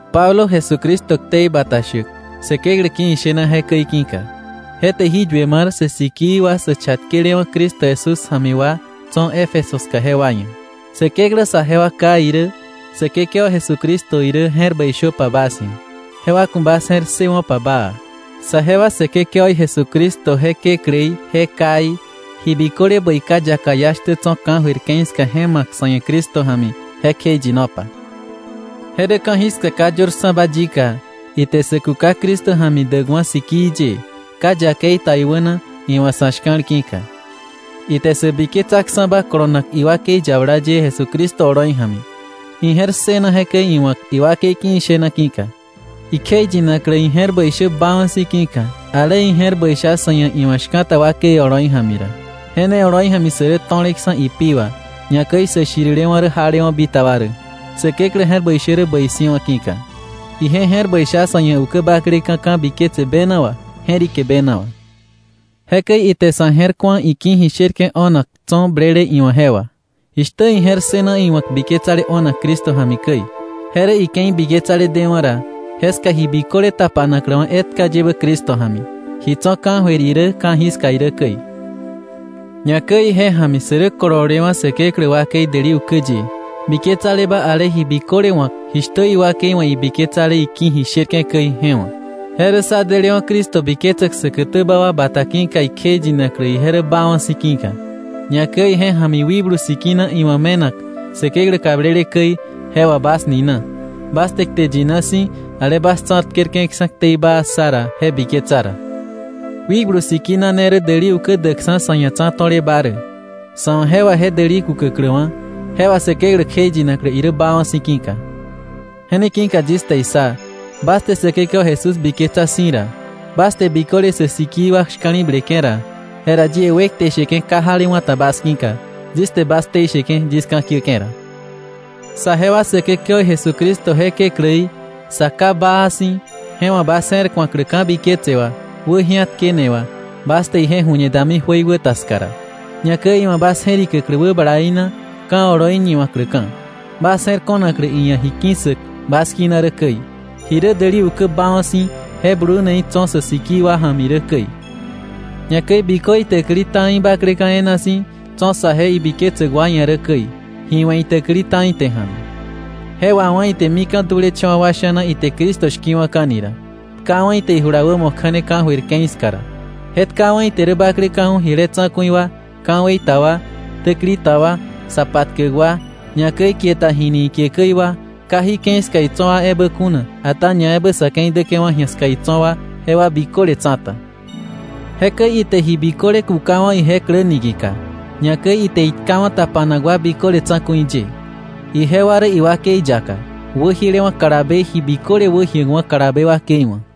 Pablo, Jesucristo ktei bata shäk Säkeklä ki̱ ishena jekäi ki̱ka, je te jí yue mar sä sikii wa sä chatkelewa̱ Cristo Jesús ja̱mi wa tso̱ Éfeso ska jewa ia̱. Säkeklä saje wa Ká irä Säkekewa Jesucristo irä je̱r bäi shöpa bas ia̱, jewa ku̱ bas je̱r ssëwo̱pa baa. Saje wa Säkekewaí Jesucristo je kekläí je Káí, ji biköle bäi ka yaka iá shtä tso̱ ka̱jöir ke̱i ska je ma̱k sa̱ ia̱ Cristo ja̱mi, je kjeiyinopa, je rä ka̱jiska ka yörksa̱ba yika, ite sä kuka Cristo ja̱mi däkwa̱ sikii ye, ka yakei ta iwäna iwa̱ sa̱ shka̱l ki̱ka. Ite sä biketsaksa̱ba kolonak iwakei yabala ye Jesucristo oloi ja̱mi, ije̱r ssëna jekäi iwa̱k, iwakei ki̱ ishena ki̱ka, ikjeiyinaklä ije̱r bäi shä baawa̱ si̱ ki̱ka, ale ije̱r bäi sha sa̱ ia̱ iwa̱ shka̱ta wakei oloi ja̱mi ra. Je ne oloi ja̱mi sä rä to̱leksa̱ ipi wà, ñakäi sä shirilewa̱ rä jalewa̱ bitaba rä, Säkeklä je̱r bäi shä rä bäi si̱wa̱ ki̱ka. Ije je̱r bäi sha sa̱ ia̱ ukä bakleka̱ ka̱biketse bena wà je̱rike bena wà. Jekäi ite sa̱ je̱r ku̱a iki̱ ji sherke̱ o̱nak tso̱ blele iwa̱ je wà, jishtä ije̱r ssëna iwa̱k biketsale o̱nak Cristo ja̱mi käi. Je rä ike̱i biketsale dewa̱ ra, jeska ji biköle tapanakläwa̱ etka yebä Cristo ja̱mi, ji tso̱ ka̱jöir irä ka̱jiska irä käi. Ñakäi ije ja̱mi sä rä kololewa̱ Säkeklä wakei däli ukä ye, biketsaleba ale ji biköle wa̱k jishtä iwakei wa̱ ibiketsale iki̱ ji sherke̱ käi je wa̱, je rä sá je̱r bläk Cristo ja̱mi säkätäba wa bata ki̱ka ikjeiyinaklä ije rä baawa̱ si̱ ki̱ka. Ñakäi ije ja̱mi Wikblu Sikina iwa̱ me̱nak Säkeklä kablele käi je wà bas nina, bas te kte yina si̱, ale bas tsa̱tkerke̱ksa̱ ktei baa ssa ra, je biketsa ra. Wikblu Sikina ne rä däli ukä däkksa̱ sa̱ ia̱ tsa̱to̱leba rä, sa̱ wa̱ je wà je däli kukäkläwa̱, je wà Säkeklä kjeiyinaklä irä baawa̱ si̱ ki̱ka. Je ne ki̱ka yis te issa, bas te Säkekewa Jesús biketsa si̱ ra, bas te biköle sä sikii wa shka̱li̱bleke̱ ra, jera yie wekte sheke̱ ka jalewa̱ ta bas ki̱ka, yis te bas ktei sheke̱ yis ka̱kiäke̱ ra, saje wa Säkekewaí Jesucristo je Kekläí, Sa Ká baa si̱, je wa̱ bas je̱r ku̱aklä ka̱biketse wà, wäji̱atkene wà, bas te ije ju̱ñe dami jöiwäta ska ra, ñakäi iwa̱ bas je̱rikäklä wäbalaí na ka̱ oloi ñiwa̱kläka̱, bas je̱r ko̱naklä iia̱ ji ki̱ssäk bas kina rä käi, ji rä däli ukä baawa̱ si̱ je bluneí tso̱ sä sikii wa ja̱mi rä käi, ñakäi bikö itäkili ta̱i bakleka̱ e̱e̱na si̱ tso̱ saje ibiketsäk wa ia̱ rä käi, ji we̱ itäkili ta̱i te ja̱mi. Je wawá̱ ite mika̱ dulecha̱wa̱ wa sha̱na ite Cristo shki̱wa̱ka̱ni ra, tkawa̱ ite ijula wämo kja̱ne ka̱jöir ke̱i ska ra. Je tkawa̱ ite rä bakleka̱ju̱ jile tsa̱ku̱i wa, ka̱wei ta wa, täkili ta wa, sa patkäk wa, ñakäi kie ta jini ikie käi wa, ka jí ke̱i ska itso̱ wa ebä kuna, ata ñaebä sa̱ ke̱i däke̱wa̱ ji̱a ska itso̱ wa, jewa biköle tsa̱ta. Jekäi ite ji biköle kukawa̱ ije klä niki̱ka, ñakäi ite itkawa̱ tapanak wa biköle tsa̱ku̱i ye. Ijewa rä iwakei yaka, wäjielewa̱ kalabe ji biköle wäjiäkwa̱ kalabe wakei wa̱.